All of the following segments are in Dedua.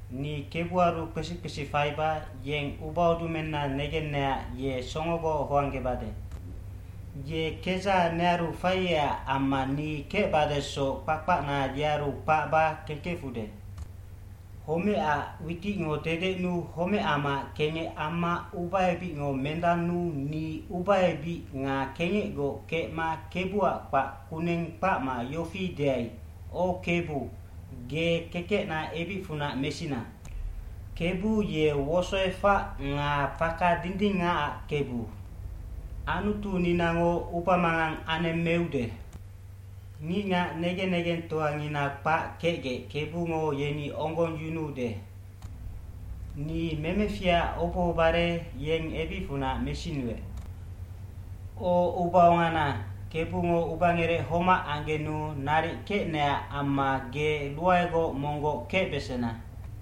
Ni kebuaru kpesi kpesi faiba yeng ubaudumenna negenecac ye songogoc hoanggebade. Ye kedzaha nearu faiecac amma ni kecbadesoc kpakpacna yearu kpacba kengkefude.a Homecac witicngo dedecnuu homecamaac kengec amma ubaebicngo mendannuu ni ubaebic nga kengecgoc kecmab Kebuac kpac kuneng kpacma yofi deai, “O Kebu, ge kekecna ebicfunac mesina.” Kebu ye wosoefac nga faka dindingacac Kebu. Anutuninango ubamangang anemmeude. Ngicngac negen negengtoangina kpac kecgec Kebungo yeni onggongyunuude. Ni memeficac obohobare yeng ebicfunac mesinuec. O ubaongana, Kebungo ubangerec homac anggenu naric kecnecac amma ge ruaegoc monggoc kecbesena.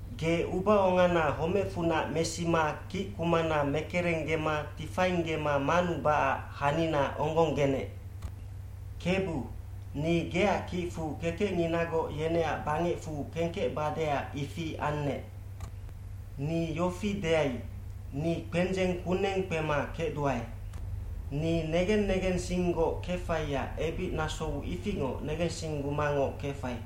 Ge ubaongana homecfunac mesima kickumana mekerenggema tifainggema manubacac hanina onggonggenec. Kebu, ni geac kicfu kekecnginagoc yeneac bangecfu kengkecbadeac ifi annec. cNi yofi deai, “Ni kpendzeng kuneng kpema kecduae.” Ni negen negensinggoc kefaiac ebicnasou ifingoc negensinggumangoc kefai.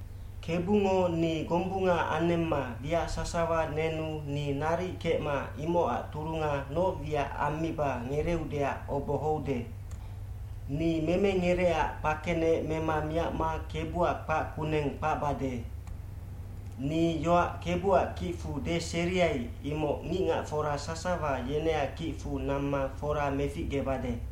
Kebungo ni gombunga anemma wiac sasawa nenu ni naric kecma imocac turunga noc wiac ammiba ngereeudeac obohoude. Ni memengerecac kpakenec mema miacma Kebuac kpac kuneng kpacbade. Ni yoac Kebuac kicfu deseriai, imoc ngicngacfora sasawa yeneac kicfu namma fora meficgebade.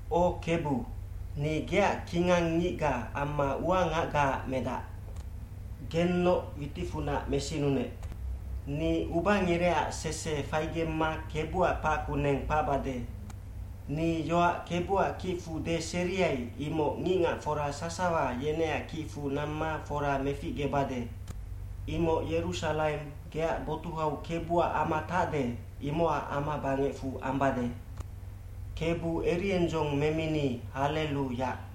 O Kebu, ni geac kingang ngicga amma uangacgaac medac. Gennoc witicfunac mesinunec. Ni ubangerecac sese faigemma Kebuac kpac kuneng kpacbade. Ni yoac Kebuac kicfu deseriai, imoc ngicngacfora sasawa yeneac kicfu namma fora meficgebade. Imoc Yerusalaim, geac botuhau Kebuac ama tacde, imocac amabangecfu ambade. Kebu eriendzong memini, hallelu Yac.